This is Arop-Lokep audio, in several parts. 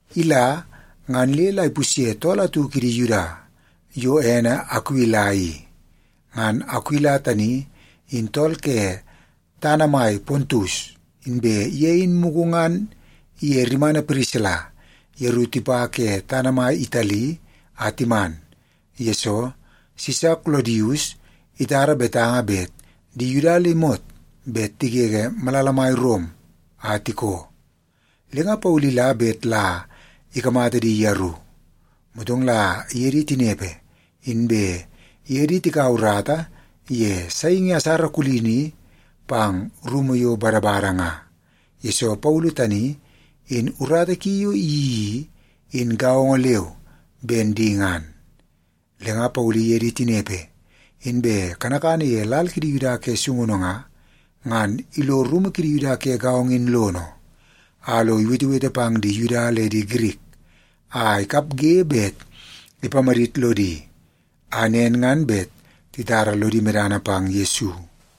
Ila, ngan le la ipusye tool atu kidi Yuda yo ene Akuila i. Ngan Akuila tani in tool ke tana mai Pontus, inbe ye in mugu ngan iye rimana Pirisila yeru tipa ke tana mai Itali a timan, yesoo Sisa Kolodius itara betanga bet di Yuda le imot bet tigege malala mai Rom a tikoo. Le nga Paulu ila bet la ikamata di yeru. Motong la iye di tinepe, inbe iye di tikaua urata ye saingi asara kulini pang rumu yo badabada nga, yesoo Paulu tani in urata ki yo iyeii i, in gaongo leu ben di ngan. Le nga Paulu iye di tinepe, inbe kanakana ye lal kidi Yuda ke sungunu nga, ngan ilo rumu kidi Yuda ke gaongo in lono, a lo iwetewete pang di Yuda le Girik a ikapge bet ipamadit lodi, a nen ngan bet titara lodi medana pang Yesu.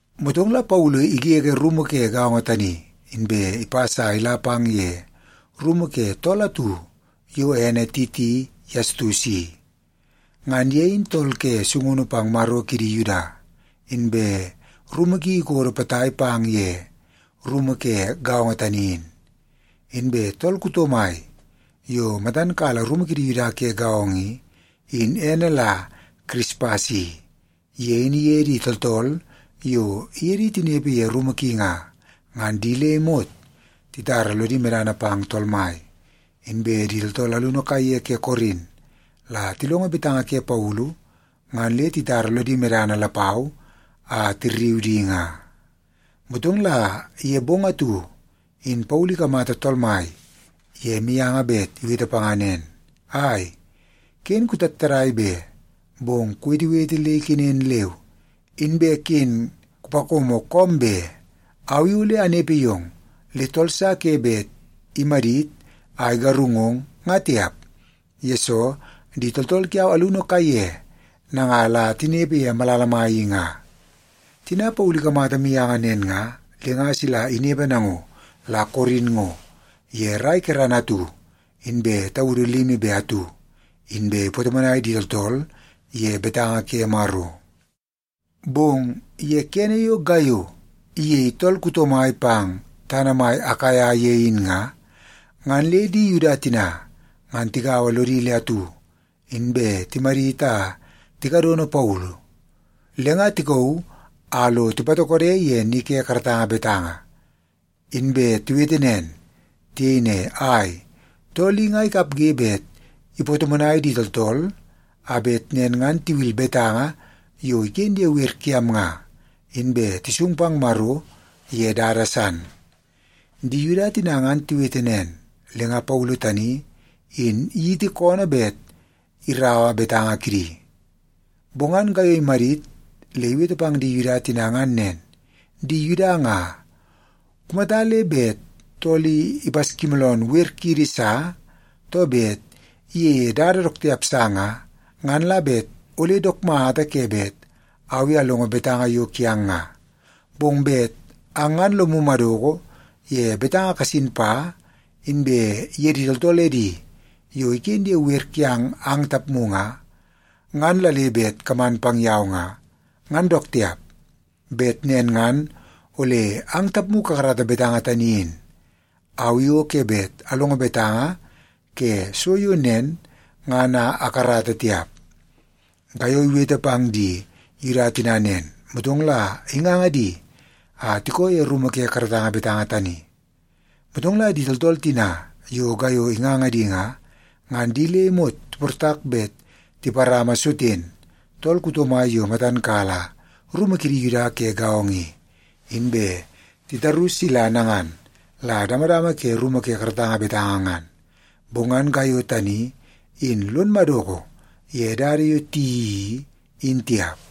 Motong la Paulu igege rumu ke gaongo tani, inbe ipas a ila pang ye rumu ke tool atu yo ene Titi Yastus i. Ngan ye in tool ke sungunu pang Maro kidi Yuda, inbe rumu ki ikodo potai pang ye rumu ke gaongo tani in. Inbe tool kuto mai yo matan kala rumu kidi Yuda ke gaongo i, in ene la Kirispas i. Ye in iye di tooltool yo iye di tinepe ye rumu ki nga, ngan di le imot titara lodi medana pang Tool Mai. Inbe di tooltool alunu kaiye ke Korin la tilongo betanga ke Paulu, ngan le titara lodi medana lapau a tirriu di nga. Motong la ye bong atu in Paulu ikamata Tool Mai ye mianga bet iwete panga nen, “Ai, ken kutattadai be! Bong kuwetewete le ikenen leu, inbe ken kupakomo koom be. Au i ole anepe yong, le tool sa ke bet imadit a igarungong, nga tiap, yesoo di tooltool kiau alunu kaiye nanga la tinepe ye malala mai i nga.” Tina Paulu ikamata mianga nen nga, le nga sila inepe nango la Korin ngo ye rai kerana atu inbe taudu limi be atu, inbe ipatomonai di tooltool ye betanga ke Maro. Bong ye kene yo Gaiyo iyei tool kuto mai pang tana mai Akaia ye in nga, ngan le di Yuda tina ngan tigaua lodi le atu, inbe timadit a tikadono Paulu. Le nga tikauu a lo tipatokode ye ni ke karatanga betanga, inbe tiwete nen. Tiyei ne, “Ai, tool i nga ikapge bet ipatomonai di tooltool, a bet nen ngan tiwil betanga yo iken ye wer kiam nga, inbe tisung pang Maro ye dada san.” Di Yuda tina ngan tiwete nen, le nga Paulu tani in iyiti koonoo bet iraua betanga kidi. Bong ngan Gaiyo imadit le iwete pang di Yuda tina ngan nen, “Di Yuda nga, kumata le bet tool i ipaskimooloonoo wer kiidi sa, too bet iyeie dada dook tiap sa nga, ngan la bet ole dook mata ke bet au i alongo betanga yo kiang nga. Bong bet ang ngan lomu madoko ye betanga kasin pa, inbe ye di tooltool edi yo iken ye wer kiang ang tapmu nga, ngan la le bet kaman pang yau nga, ngan dook tiap. Bet nen ngan ole ang tapmu kakarata betanga tani in. Au i o ke bet alongo betanga ke so yo nen ngan a akarata tiap.” Gaiyo iwete pang di Yuda tina nen, motong la inganga di a tikoo ye rumu ke karatanga betanga tani. Motong la di tooltool tina yo Gaiyo inganga di nga, ngan di le imot tiportak bet tiparama Soten, tool kuto mai yo matan kala rumu kidi Yuda ke gaongo i, inbe tirauu sila nangan la damadama ke rumu ke karatanga betanga ngan. Bong ngan Gaiyo tani in lon madoko ye dada yo tiyeii i, in tiap.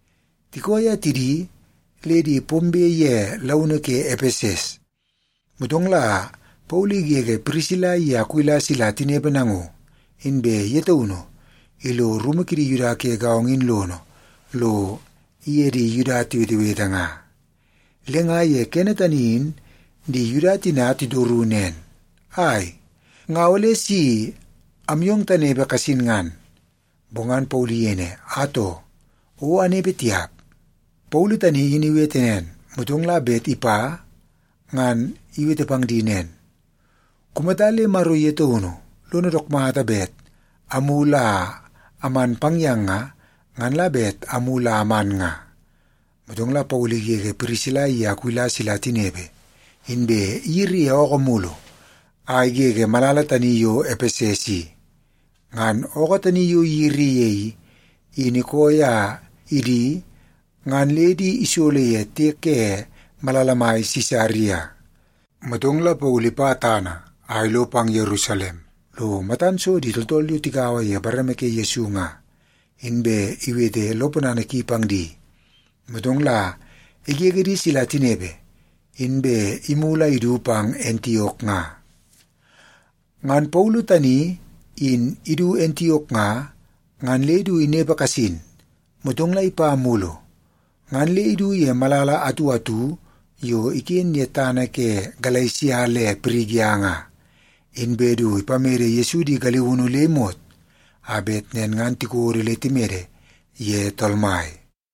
Tikooi a tidi, le di pombe ye launu ke Epeses, motong la Paulu igege Pirisila iye Akuila sila tinepe nango, inbe ye taunu ilo rumu kidi Yuda ke gaongo in lono lo iye di Yuda tiwetewete nga. Le nga ye kene tani in di Yuda tina titoru nen, “Ai, nga ole si amyong tanepe kasin ngan.” Bong ngan Paulu iyei ne, “Atoo, o anepe tiap.” Paulu tani in iwete nen, motong la bet ipa, ngan iwete pang di nen, “Kumata le Maro ye taunu lono dook mata bet amulu a aman pang yang nga, ngan la bet amulu a aman nga.” Motong la Paulu igege Pirisila iye Akuila sila tinepe, inbe iyiri ye ookoo mulu a igege malala tani yo Epeses i. Ngan ookoo tani yo iyiri ye i, in ikooi a idi ngan le di isolo ye tiek ke malala mai Sisaria. Motong la Paulu ipa tana a ilo pang Yerusalem lo matan so di tooltool yo tigaua ye bareme ke Yesu nga, inbe iwete lo ponana ki pang di. Motong la igege di sila tinepe, inbe imulu a idu pang Antiok nga. Ngan Paulu tani in idu Antiok nga, ngan le du inepe kasin, motong la ipa mulu. Ngan le idu ye malala atu atu yo iken ye tana ke Galesia le Pirigia nga, inbe du ipamede Yesu di galiunu le imot a bet nen ngan tikodo le timede ye Tool Mai.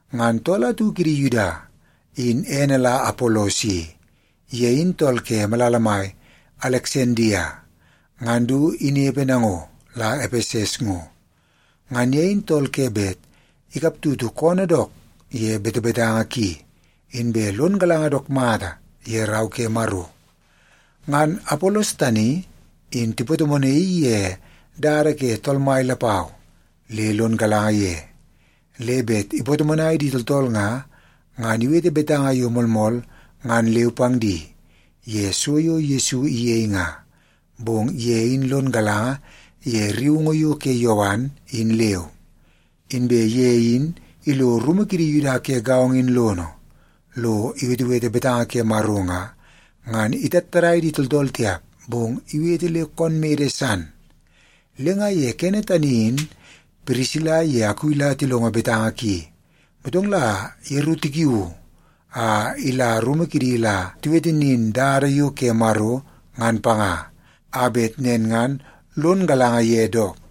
Ngan tool atu kidi Yuda in ene la Apolos i. Ye in tool ke malala mai Aleksandia ngan du inepe nango la Epeses ngo. Ngan ye in tool ke bet ikap tutu koonoo dook ye betebetanga ki, inbe lon galanga dook mata ye Rau ke Maro. Ngan Apolos tani in tipatomonaii ye dada ke Tool Mai lapau le lon galanga ye. Le bet ipatomonai di tooltool nga, ngan iwete betanga yo moolmool ngan leu pang di ye so yo Yesu iyei nga. Bong ye in lon galanga ye rriungu yo ke Yowan, in leu. Inbe ye in ilo rumu kidi Yuda ke gaongo in lono, lo iwetewete betanga ke Maro nga, ngan itattadai di tooltool tiap, bong iwete le koon mede san. Le nga ye kene tani in Pirisila iye Akuila tilongo betanga ki, motong la yeru tikiuu a ila rumu kidi la tiwete nin dada yo ke Maro ngan panga, a bet nen ngan lon galanga ye dook.